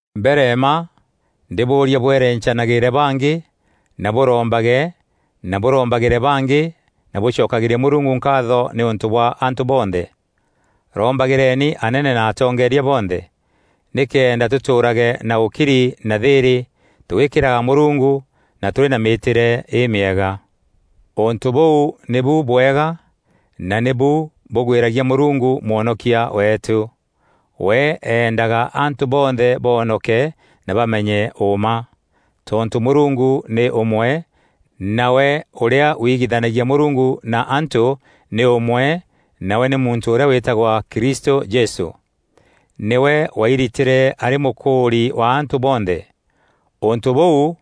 Mbere mma ndîbûûria bwerencanagîîre bangî na bûrombage na bûrombagîre bangî na bûcokagîrie Mûrungu nkaatho nîûntû bwa antû bonthe. Rombagîreni anene na atongeeria bonthe, nîkenda tûtûûrage na ûkiri na thîîrî, tûgîkîraga Mûrungu na tûrî na mîîtîre îmîega. Ûntû bûu nîbu bwega na nîbu bûgwîragia Mûrungu Mwonokia weetû. We eendaga antû bonthe boonoke na bamenye ûûma. Tontû Mûrungu nî ûmwe, nawe ûrîa wigithanagia Mûrungu na antû nî ûmwe nawe nî muntû ûrîa wîtagwa Kristû Jesû. Nîwe wairitîre arî mûkûûri wa antû bonthe. Ûntû bûu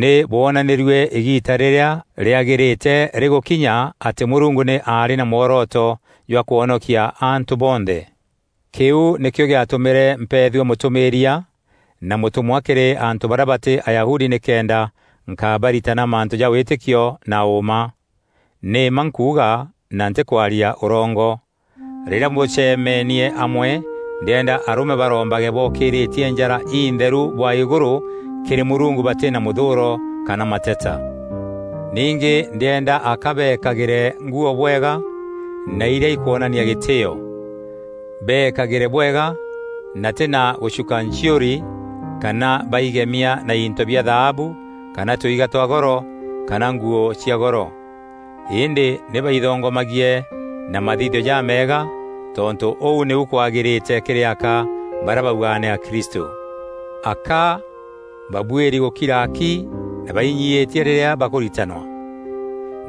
nî bwonanîrue îgiita rîrîa rîagîrîte rîgûkinya atî Mûrungu nî aarî na mworoto jwa kwonokia antû bonthe. Kîu nîkîo gîatûmîre mpeethua mûtûmîîria na mûtûmwa kîrî antû barîa batî Ayahudi nîkenda nkabaritana mantû ja wîtîkio na ûûma. Nî mma nkuuga na ntîkwaria ûrongo. Rîrîa bûcemenie amwe ndîenda arûme barombage bookîîrîtie njara intherû bwa îgûrû kîrî Mûrungu batî na mûthûûro kana mateta. Ningî ndîenda aka bekagîre nguû bwega na irîa ikwonania gîtîîo. Beekagîre bwega na tî na gûcuka nchiûri kana baigemia na into bia thaabu kana tuiga twa goro kana nguû cia goro, îndî nî baithongomagie na mathithio jameega, tontû ûu nîu kwagîrîte kîrî aka barîa baugaga nî akristû. Aka babuîri gûkira ki na bainyiîtie rîrîa bakûritanwa.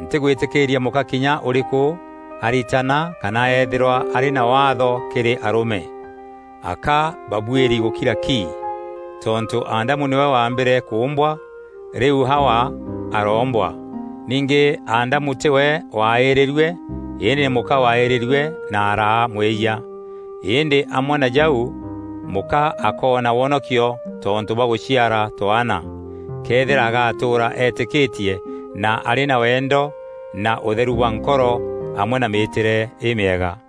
Ntîgwîtîkîîria mûka kinya ûrîkû aritana kana eethîrwa arî na waatho kîrî arûme. Aka babuîri gûkira ki. Tontû Adamu nîwe waambîre kûûmbwa, rîu Hawa aroombwa. Ningî Adamu tîwe waaîrîrue îndî nî mûka waaîrîrue na araa mwîyia. Îndî amwe na jau mûka akoona wonokio tontû bwa gûciara twaana, këethîra agatûûra eetîkîtie na arî na wendo na ûtheru bwa nkoro amwe na mîîtîre îmîega.